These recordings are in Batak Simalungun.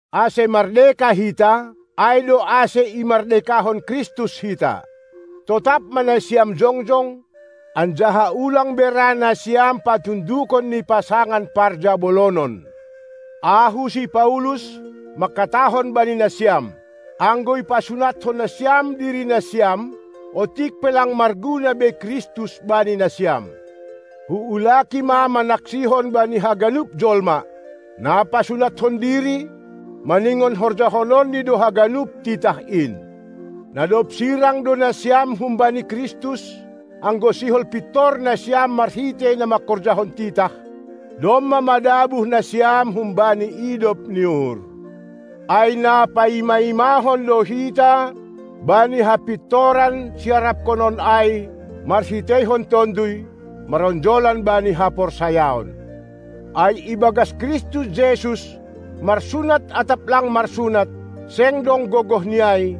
Ase mardeka hita, ai do ase imardekahon Kristus hita. Totap ma nasiam jongjong, anjaha ulang be ra nasiam patundukon ni pasangan parjabolonon! Ahu si Paulus manghatahon bani nasiam: Anggo ipasunathon nasiam diri nasiam, otik pe lang marguna be Kristus bani nasiam. Huulaki ma manaksihon bani haganup jolma: Na pasunathon diri, maningon horjahononni do haganup titah in. Na dob sirang do nasiam humbani Kristus, anggo sihol pintor nasiam marhitei na mangkorjahon titah, domma madabuh nasiam humbani idop ni uhur. Ai na paima-imahon do hita bani hapintoran siaraphonon ai marhiteihon Tonduy, maronjolan bani haporsayaon. Ai ibagas Kristus Jesus marsunat atap lang marsunat, seng dong gogoh ni ai,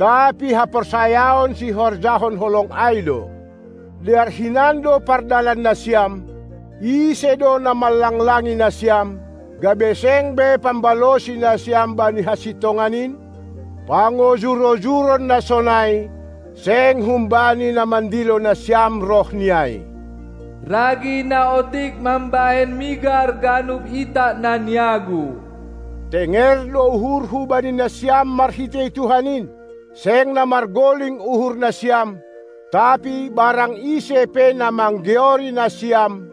tapi haporsayaon sihorjahon holong ai do. Dear hinan do pardalan nasiam, ise do na manlanglangi nasiam, gabe seng be pambalosi nasiam bani hasintongan in? Pangojur-ojuron na sonai, seng humbani na mandilo nasiam roh ni ai. Ragi na otik mambahen migar ganup itak na niagu. Tenger do uhurhu bani nasiam marhitei Tuhan in, seng na margoling uhur nasiam. Tapi barang ise pe na manggeori nasiam,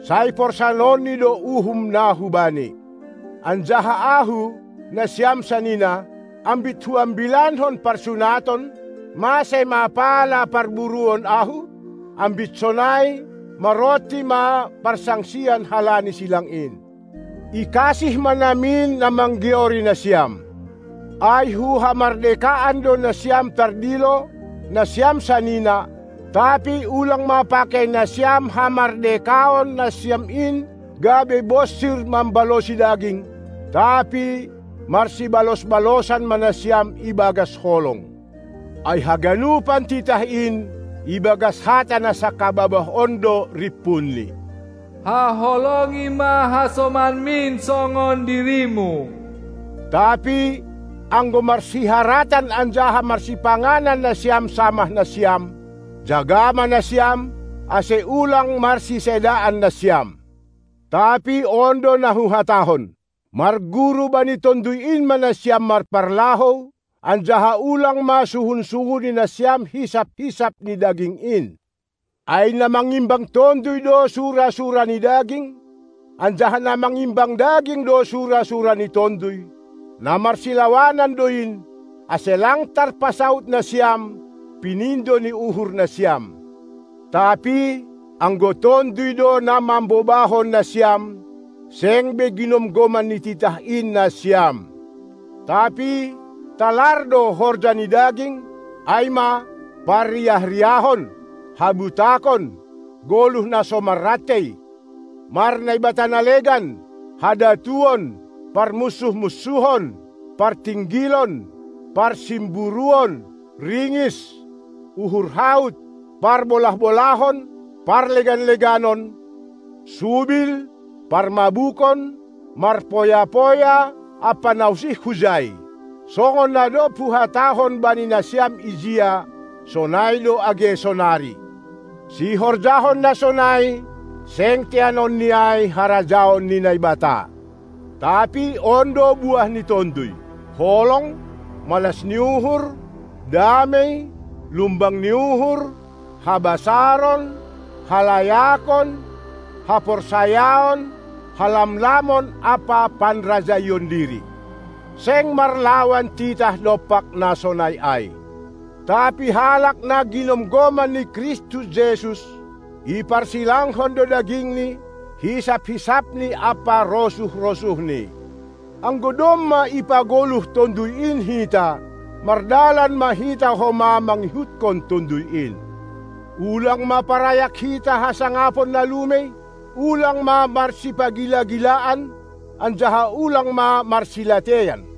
sai porsanonni do uhum na hubani. Anjaha ahu, nasiam sanina, ambit huambilankon parsunaton, mase ma pala parburuon ahu? Ambit sonai, maronti ma parsangsian halani silang in. Ikasih ma namin na manggeori nasiam. Ai hu hamardekaan do nasiam tardilo, nasiam sanina, tapi ulang ma pakei nasiam hamardekaon nasiam in gabe bonsir mambalosi daging, tapi marsibalos-balosan ma nasiam ibagas holong. Ai haganup titah in ibagas hata na sangkababah on do rimpunni: Haholongi ma hasomanmin songon dirimu! Tapi anggo marsiharatan anjaha marsipanganan nasiam samah nasiam, jaga ma nasiam, ase ulang marsisedaan nasiam. Tapi on do na huhatahon: Marguru bani Tonduy in ma nasiam marparlahou, anjaha ulang ma suhun-suhuni nasiam hisap-hisap ni daging in. Ai na mangimbang tonduy do sura-sura ni daging, anjaha na mangimbang daging do sura-sura ni tonduy; na marsilawanan do in, ase lang tarpasaud nasiam, pinindo ni uhur nasiam. Tapi, anggo Tonduy do na mambobahon nasiam, seng be ginomgoman ni titah in nasiam. Tapi talar do horja ni daging, ai ma: Parriah-riahon, habutakon, goluh na so marrantei, marnaibata na legan, hadatuon, parmunsuh-munsuhon, partinggilon, parsimburuon, ringis, uhur haut, parbolah-bolahon, parlegan-leganon, subil, parmabukon, marpoya-poya ampa na usih hujai. Songon na dob huhatahon bani nasiam ijia, sonai do age sonari: Sihorjahon na sonai, seng teanon ni ai harajaon ni Naibata. Tapi on do buah ni Tonduy: Holong, malas ni uhur, damei, lumbang ni uhur, habasaron, halayakon, haporsayaon, halamlamon ampa panrajaion diri. Seng marlawan titah dompak na sonai ai. Tapi halak na ginomgoman ni Kristus Jesus, iparsilangkon do dagingNi, hisap-hisapni ampa rosuh-rosuhni. Anggo domma ipagoluh Tonduy in hita, mardalan ma hita homa mangihuthon Tonduy in. Ulang ma parayak hita hasangapon na lumei, ulang ma marsipagila-gilaan, anjaha ulang ma marsilateian.